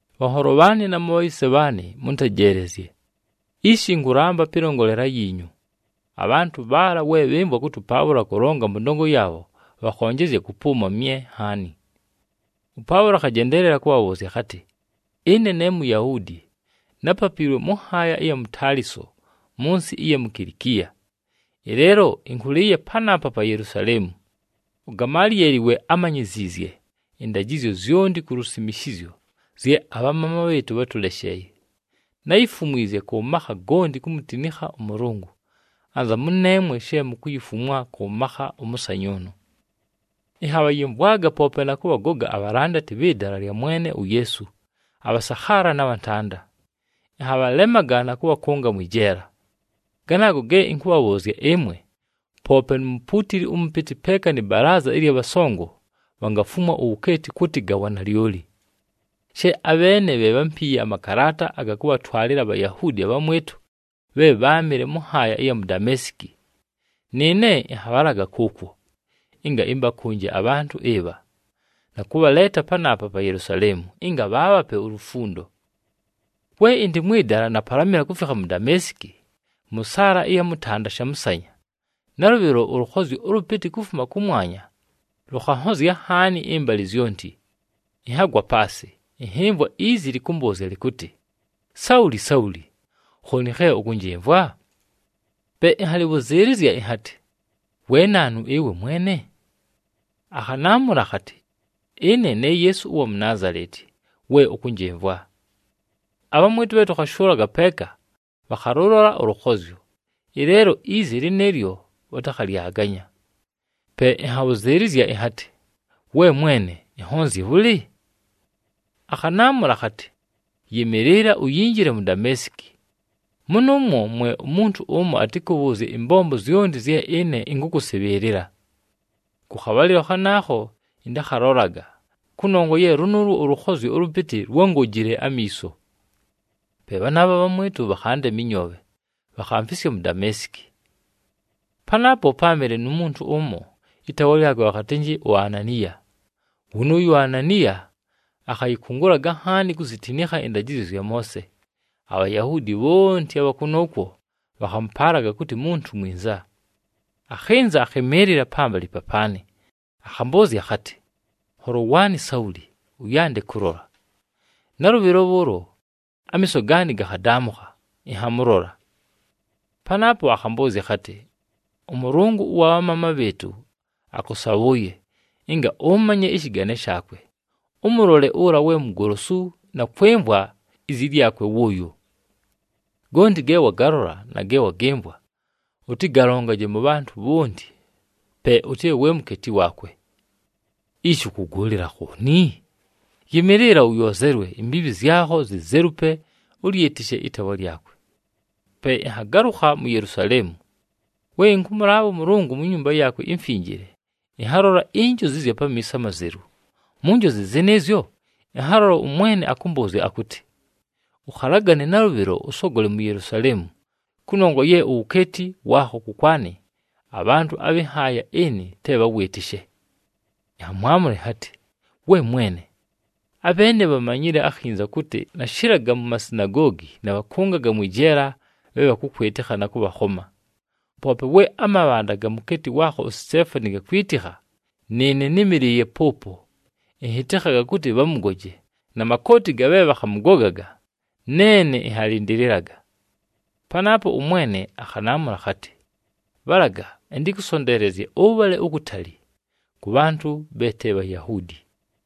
“Bhanholo bhaanɨ na mubhayise bhaanɨ, mʉntejeelezye! Ishi ɨnkʉlamba pɨlongolela yiinyu.” Abhantʉ bhaala, we bhɨmvwa kʉtɨ ʉPaʉlo akʉlonga mʉ ndongo yaabho, bhakhonjezya kʉpʉʉma mye nhaani. ɄPaʉlo akhajendeelela kʉbhabhʉʉzya akhatɨ, “Ɨne ne Muyahuudi, nápapiilwe mʉ nhaaya ɨya mu Taliso mʉ nsɨ ɨya mu Kilikiya. Ɨleelo ɨnkʉlɨɨye panaapa pa Yelusaleemu. UGamalieli we ámanyiziizye ɨndajɨzyo zyonti ku lusimishizyo zye abhamaama bhɨɨtʉ bhátʉlesheeye. Náyifumwizye kʉ makha gonti kumutinikha ʉMʉlʉngʉ, anza mʉneemwe she mukuyifumwa kʉ makha ʉmʉsanyʉʉnʉ. “Ɨnhabhayɨmvwaga poope na kʉbhagoga abhalandati bhɨ Dala lya Mwene uYeesu abhasakhaala na bhantanda, ɨnhabhalemaga na kʉbhakʉnga mwɨ jeela. Ganaago ge ɨnkʉbhabhʉʉzya ɨmwe, poope nu mupuutili ʉmʉpɨtɨ peeka nɨ balaaza ɨlya bhasongo bhangafumwa uwukeeti kʉtɨ ga wanalyoli. She abheene bhe bhámpiiye amakalaata aga kʉbhatwalɨla aBhayahuudi abhamwɨtʉ bhe bháamɨle mʉ nhaaya ɨya mu Dameesiki, nɨɨne ɨnhabhalaga kʉʉkwo, ɨnga ɨmbakʉnje abhantʉ ɨbha, na kʉbhaleeta panaapa pa Yelusaleemu, ɨnga bhaabhape ulufundo. “We ɨndɨ mwɨ dala, napalamɨla kufikha mu Dameesiki, mʉ saala ɨya mʉtanda shamʉsanya, nalʉbhɨlo ʉlʉkhozyo ʉlʉpɨtɨ kufuma kʉmwanya lʉkhanhozya nhaani ɨmbalɨ zyonti. Ɨnhagwa paasɨ, ɨnhɨmvwa izi lɨkʉmbʉʉzya lɨkʉtɨ, ‘Sauli! Sauli! Khooni khe ʉkʉnjɨmvwa?’ Pe ɨnhabhʉzɨɨlɨzya ɨnhatɨ, ‘We naanu ɨwe Mwene?’ Akhanaamʉla akhatɨ, ‘Ɨne ne Yeesu ʉwa mu Naazaleti, we ʉkʉnjɨmvwa.’ Abhamwɨtʉ bhe tʉkhashʉʉlaga peeka bhakhalʉlola ʉlʉkhozyo, ɨleelo izi lɨnɨɨlyo bhatakhalyaganya. Pe ɨnhabhʉzɨɨlɨzya ɨnhatɨ, ‘We Mwene, ɨnhonzye bhʉlɨ?’ Akhanaamʉla akhatɨ, ‘Yɨmɨɨlɨla! Uyinjile mu Dameesiki. Mʉnʉʉmwo mwe umuntu ʉmo atɨkʉbhʉʉzye ɨmbombo zyonti zye ɨne ɨnkʉkʉsɨbhɨɨlɨla.’ Kʉ khabhalɨlo khanaakho ɨntakhalolaga, kʉnongwa ye lʉnʉʉlwo ʉlʉkhozyo ʉlʉpɨtɨ lwángojile amiiso. Pe bhanaabho abhamwɨtʉ bhakhandema ɨnyoobhe, bhakhamfisya mu Dameesiki. “Panaapo páamɨle nu muntu ʉmo, ɨtaawa lyakwe bhakhatɨnjɨ uAnaniya. Wʉnʉʉyo uAnaniya akhayɨkʉngʉlaga nhaani kuzitinikha ɨndajɨzyo zya Moose. ABhayahuudi bhonti abha kʉnʉʉkwo bhakhamʉpaalaga kʉtɨ muntu mwinza. Akhɨnza, akhɨmɨɨlɨla pambalɨ papaanɨ, akhambʉʉzya akhatɨ, ‘Nholo waanɨ Sauli, ʉyande kʉlola.’ Nalʉbhɨlo bhʉʉlo amiiso gaanɨ gakhadaamʉkha, ɨnhamʉlola. “Panaapo akhambʉʉzya akhatɨ, ‘ɄMʉlʉngʉ ʉwa bhamaama bhɨɨtʉ akʉsabhʉʉye, ɨnga ʉmanye ɨshɨgane shaakwe, ʉmʉlole ʉla we Mugolosu na kwɨmvwa izi lyakwe wʉʉyo. Gonti ge wagalola na ge wagɨmvwa, ʉtɨgalongaje mʉ bhantʉ bhonti, pe ʉtɨbhe we mukeeti waakwe. Ishi, ʉkʉgʉʉlɨla khooni? Yɨmɨɨlɨla! Ʉyoozelwe, imbiibhi zyakho zizelupe, ʉlyɨtɨshe ɨtaawa lyakwe.’ “Pe ɨnhagalʉkha mu Yelusaleemu. We ɨnkʉmʉlaabha ʉMʉlʉngʉ mu nyumba yaakwe imfinjile, ɨnhalola injozi ɨzya pamiiso amazelu. Mu njozi zɨnɨɨzyo, ɨnhalola ʉMwene akʉmbʉʉzya akʉtɨ, ‘Ʉkhalagane nalʉbhɨlo, ʉsogole mu Yelusaleemu! Kʉnongwa ye uwukeeti waakho kʉkwanɨ, abhantʉ abhɨ nhaaya ɨnɨ te bhawɨɨtɨshe.’ Ɨnhamwamʉla ɨnhatɨ, ‘We Mwene, abheene bhamanyile akhinza kʉtɨ nashɨlaga mu masinagoogi nabhakʉngaga mwɨ jeela bhe bhakʉkwɨtɨkha na kʉbhakhoma! Poope we amabhanda ga mukeeti waakho uSiteefani gakwitikha, nɨɨne nɨ́mɨlɨɨye pʉʉpo ɨnhɨtɨkhaga kʉtɨ bhamʉgoje, na makooti ga bhe bhakhamʉgogaga, neene ɨnhalɨndɨlɨlaga.’ Panaapo ʉMwene akhanaamʉla akhatɨ, ‘Bhalaga! Ɨntɨkʉsonteelezye ʉbhale ukutali, kʉ bhantʉ bhe te Bhayahuudi.’”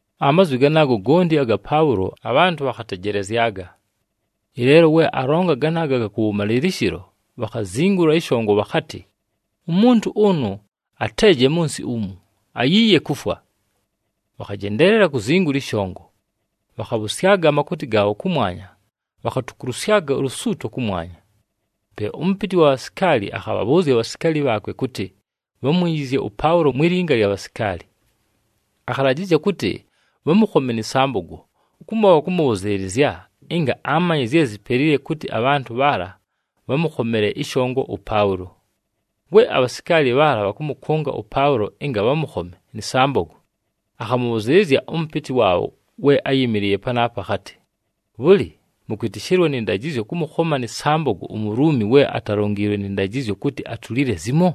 Amazwi ganaago gonti aga Paʉlo, abhantʉ bhakhatejelezyaga. Ɨleelo we alonga ganaago aga kʉwʉmalɨlɨshɨlo, bhakhazingula ɨshongo bhakhatɨ, “Umuntu ʉnʉ ateeje mʉ nsɨ umu! Ayiiye kufwa!” Bhakhajendeelela kuzingula ɨshongo, bhakhabhʉsyaga amakooti gaabho kʉmwanya, bhakhatukulusyaga ulusuuto kʉmwanya. Pe ʉmʉpɨtɨ wa bhasikaali akhabhabhʉʉzya abhasikaali bhaakwe kʉtɨ bhamwinjizye ʉPaʉlo mwi linga lya bhasikaali. Akhalajɨzya kʉtɨ bhamʉkhome nɨ sambogo, kumo bhakʉmʉbhʉzɨɨlɨzya ɨnga amanye zye zipelile kʉtɨ abhantʉ bhaala bhamʉkhomele ɨshongo ʉPaʉlo. We abhasikaali bhaala bhakʉmʉkʉnga ʉPaʉlo ɨnga bhamʉkhome nɨ sambogo, akhamʉbhʉzɨɨlɨzya ʉmʉpɨtɨ waabho we áyɨmɨlɨɨye panaapo akhatɨ, “Bhʉlɨ, mʉkwɨtɨshɨlwa nɨ ndajɨzyo kʉmʉkhoma nɨ sambogo uMuluumi, we atalongiilwe nɨ ndajɨzyo kʉtɨ atulile zimo?”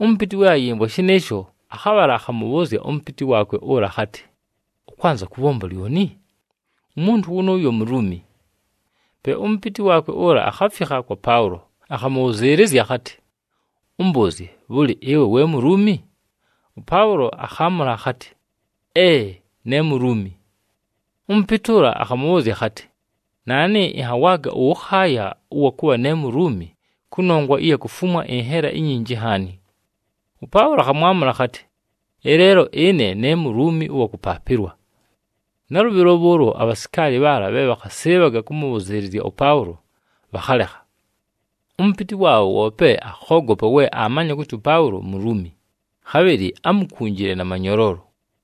Ʉmʉpɨtɨ we ayɨmvwa shɨnɨɨsho, akhabhala akhamʉbhʉʉzya ʉmʉpɨtɨ waakwe ʉla akhatɨ, “Ʉkwanza kʉbhomba lyoni? Umuntu wʉnʉʉyo Muluumi!” Pe ʉmʉpɨtɨ waakwe ʉla akhafikha kwa Paʉlo, akhamʉbhʉzɨɨlɨzya akhatɨ, “Ʉmbʉʉzye, bhʉlɨ, ɨwe we Muluumi?” ɄPaʉlo akhaamʉla akhatɨ, “Ee! Ne Muluumi.” Ʉmʉpɨtɨ ʉla akhamʉbhʉʉzya akhatɨ, “Naanɨ ɨnhawaaga ʉwʉkhaaya ʉwa kʉbha ne Muluumi kʉnongwa ɨya kufumwa ɨnhela inyinji nhaani.” ɄPaʉlo akhamwamʉla akhatɨ, “Ɨleelo ɨne ne Muluumi ʉwa kʉpaapɨlwa.” Nalʉbhɨlo bhʉʉlo abhasikaali bhaala bhe bhakhasɨɨbhaga kʉmʉbhʉzɨɨlɨzya ʉPaʉlo, bhakhalekha. Ʉmʉpɨtɨ waabho woope akhoogopa we aamanya kʉtɨ ʉPaʉlo Muluumi, khabhɨlɨ ámukunjile na manyoloolo.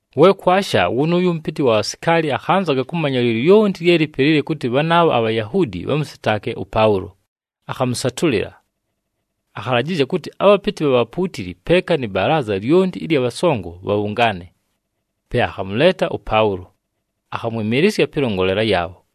We kwasha, wʉnʉʉyo ʉmʉpɨtɨ wa bhasikaali akhanzaga kʉmanya lyolyonti lye lipelile kʉtɨ bhanaabho aBhayahuudi bhamʉsɨtaake ʉPaʉlo, akhamʉsatʉlɨla. Akhalajɨzya kʉtɨ abhapɨtɨ bha bhapuutili peeka nɨ balaaza lyonti ɨlya bhasongo bhabhʉngaane. Pe akhamʉleeta ʉPaʉlo, akhamwɨmɨɨlɨsya pɨlongolela yaabho.